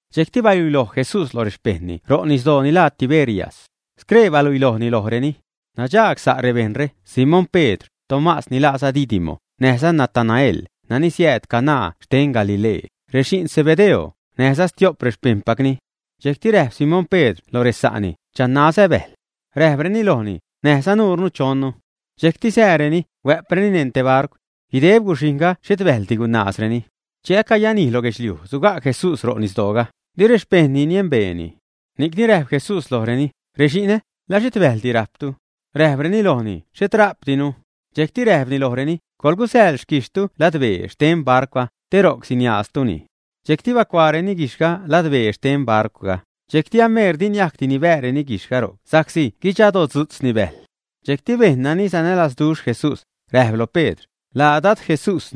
Dxejcti baluiloj Jesús loj rexpejṉni ro' nisdoo ni laa Tiberias. Scree baluilojni lojreni. Nadxaag sa' rebejṉre: Simón Pedr, Tomás ni laaza Didimo, näjza Natanael, nani siääd Caná xten Galilee, rexi'n Zebedeo, näjza stio'p rexpejṉpacni. Dxejcti räjp Simón Pedr loj resa'ni: ―Chanazä bäjl. Räjpreni lojni: ―Näjza nuure chonnu. Dxejcti sääreni, huä'preni neṉ te barcw. Guideb guxhijṉga xhet bäjldi gunaazreni. Che acayanij loj guedxliuj, suga' Jesús ro' nisdooga, di rexpejṉni niembeeni. Ni'cni räjp Jesús lojreni: ―Rexi'nä, ¿la xhet bäjldi rajptu, ä? Räjpreni lojni: ―Xhet rajpdinu. Dxejcti räjpni lojreni: ―Coḻgusäḻ xquijxhtu ladbee xten barcwga, te ro'c siniaaztuni. Dxejcti bacuaareni guijxhga ladbee xten barcwga, dxejcti ameer diniajcdi nibääreni guijxhga ro'c sa'csi gudxadotzu'tzni bäjl. Dxejcti bejṉ nani sanälazduxh Jesús, räjp loj Pedr: ―Laa Dad Jesús.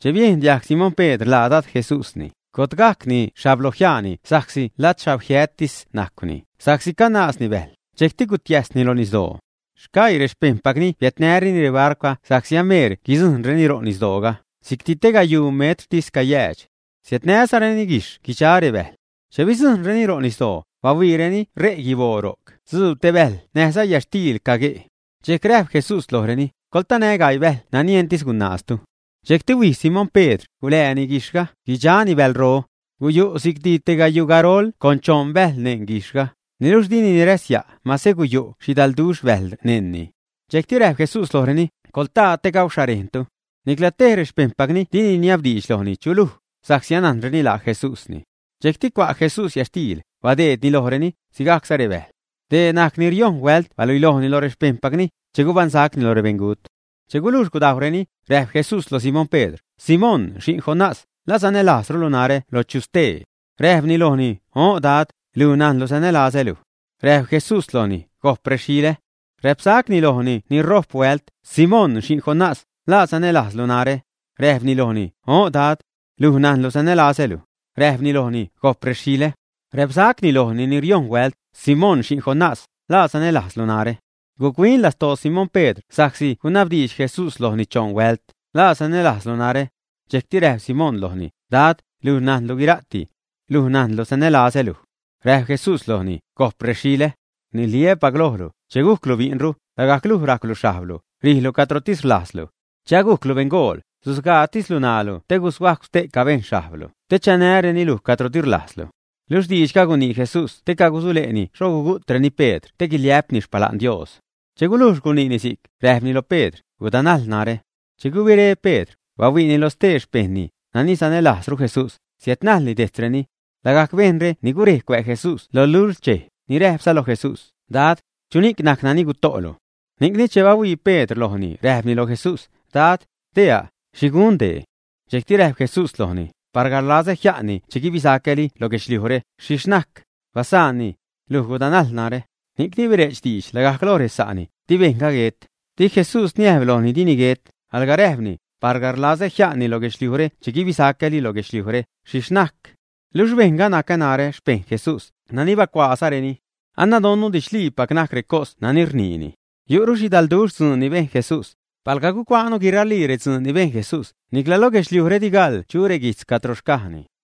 Che biejn diajg Simón Pedr laa Dad Jesús, gotgajcni xhablojiaani sa'csi ladxhagjiättis najcwni sa'csi canaazni bäjl, dxejcti gutiäjsni lo nisdoo. Sgaii rexpejṉpacni biädnäreni rebarcwga sa'csi ameer guidzujṉreni ro' nisdooga, si'cti tegayuu metrtis cayäädx. Siädnäzareni guijxh guidxa rebäjl. Che bidzujṉreni ro' nisdoo, bahuiireni re' guiboo, ro'c dzuub te bäjl näjza yätxtiil cague'. Dxejcti räjp Jesús lojreni: ―Coḻtanä gaii bäjl nani entis gunaaztu. Dxejcti huij Simón Pedr, gulääni guijxhga, guidxani bälro. Guyu' si'cti te gayuu garol con choṉ bäjl neṉ guijxhga, niluxh dini niräsya' mase guyu' xhidalduxh bäjl neṉni. Dxejcti räjp Jesús lojreni: ―Coḻtaa te gauxharejntu. Nicla tej rexpejṉpacni dini niabdiidx lojni: “¿Chu luj?” sa'csi anajnreni laa Jesúsni. Dxejcti cua' Jesús yätxtiil, badeedni lojreni, sigajcza rebäjl. Dee najc ni riojṉ huält baluilojni loj rexpejṉpacni, che gubaṉsacni loj rebeṉgut. Che gulujx gudajwreni, räjp Jesús loj Simón Pedr: ―Simón xi'n Jonás, ¿la sanälajzrulu narä loj chu stee, ä? Räjpni lojni: ―O'n, Dad, luj najnlu sanälazä luj. Räjp Jesús lojni: ―Gojp rexilä'ä. Räpsacni lojni ni rojp huält: ―Simón, xi'n Jonás, ¿la sanälajzlu narä, ä? Räjpni lojni: ―O'n, Dad. Luj najnlu sanälazä luj. Räjpni lojni: ―Gojp rexilä. Räpsacni lojni ni riojṉ huält: ―Simón xi'n Jonás, ¿la sanälajzlu narä? Guc-huin lastoo Simón Pedr sa'csi gunabdiidx Jesús lojni choṉ huält: “¿La sanälajzlu narä?” Dxejcti räjp Simón lojni: ―Dad, luj najnlu guira'ti. Luj najnlu sanälazä luj. Räjp Jesús lojni: ―Gojp rexilä. Rniliä́pac lojlu, che gujclu bi'nru, lagajc luj rajcwlu xhajblu, rijlu cadrotis rlajzlu. Che anajclu beṉgool, susgaatislu ṉaalu te gushuajcw ste'ca bejṉ xhajblu, te chanäreni luj cadro di rlajzlu. Luxh diidxga gunii Jesús te cagusule'ni xho gugu'treni Pedr te guiliä'pni xpala'n Dios. Che gulujx guniini si'c, räjpni loj Pedr: ―Gudanajl narä. Che gubiré Pedr, bahuiini loj stee xpejṉni, nani sanälajzru Jesús, siädnajlni dejtzreni. Lagajc bejṉre ni gurej cuä' Jesús lo lult xchej, ni räjpza loj Jesús: “Dad, ¿chuni'c najc nani guto'lu?” Ni'cni, che bahuii Pedr lojni, räjpni loj Jesús: ―Dad, deea', ¿xhi gun dee? Dxejcti räjp Jesús lojni: ―Palga rlazä jia'nni che guibisacäli loj guedxliujre, ¿xhixh najcni? Basaanni. Luj gudanajl narä. Ni'cni bire'ch diidx lagajc loj resa'ni, di bejṉga guet. Di Jesús niäjb lojni dini guet, alga räjpni: “palga rlazä jia'nni loj guedxliujre che guibisacäli lo guedxliujre, ¿xhixh najcni?” Luxh bejṉga najc narä, xpejṉ Jesús nani bahuiloj guiraa recosre, nani bacuaazareni. Anadonnu didxliipac najc recos nani rniini. Yu'ru xhidalduxh dzuun ni bejn Jesús. Palga gucuaanu guiralii redzuun ni bejn Jesús, nicla lo guedxliujre di gaḻ chu reguijtz cadro xcajni.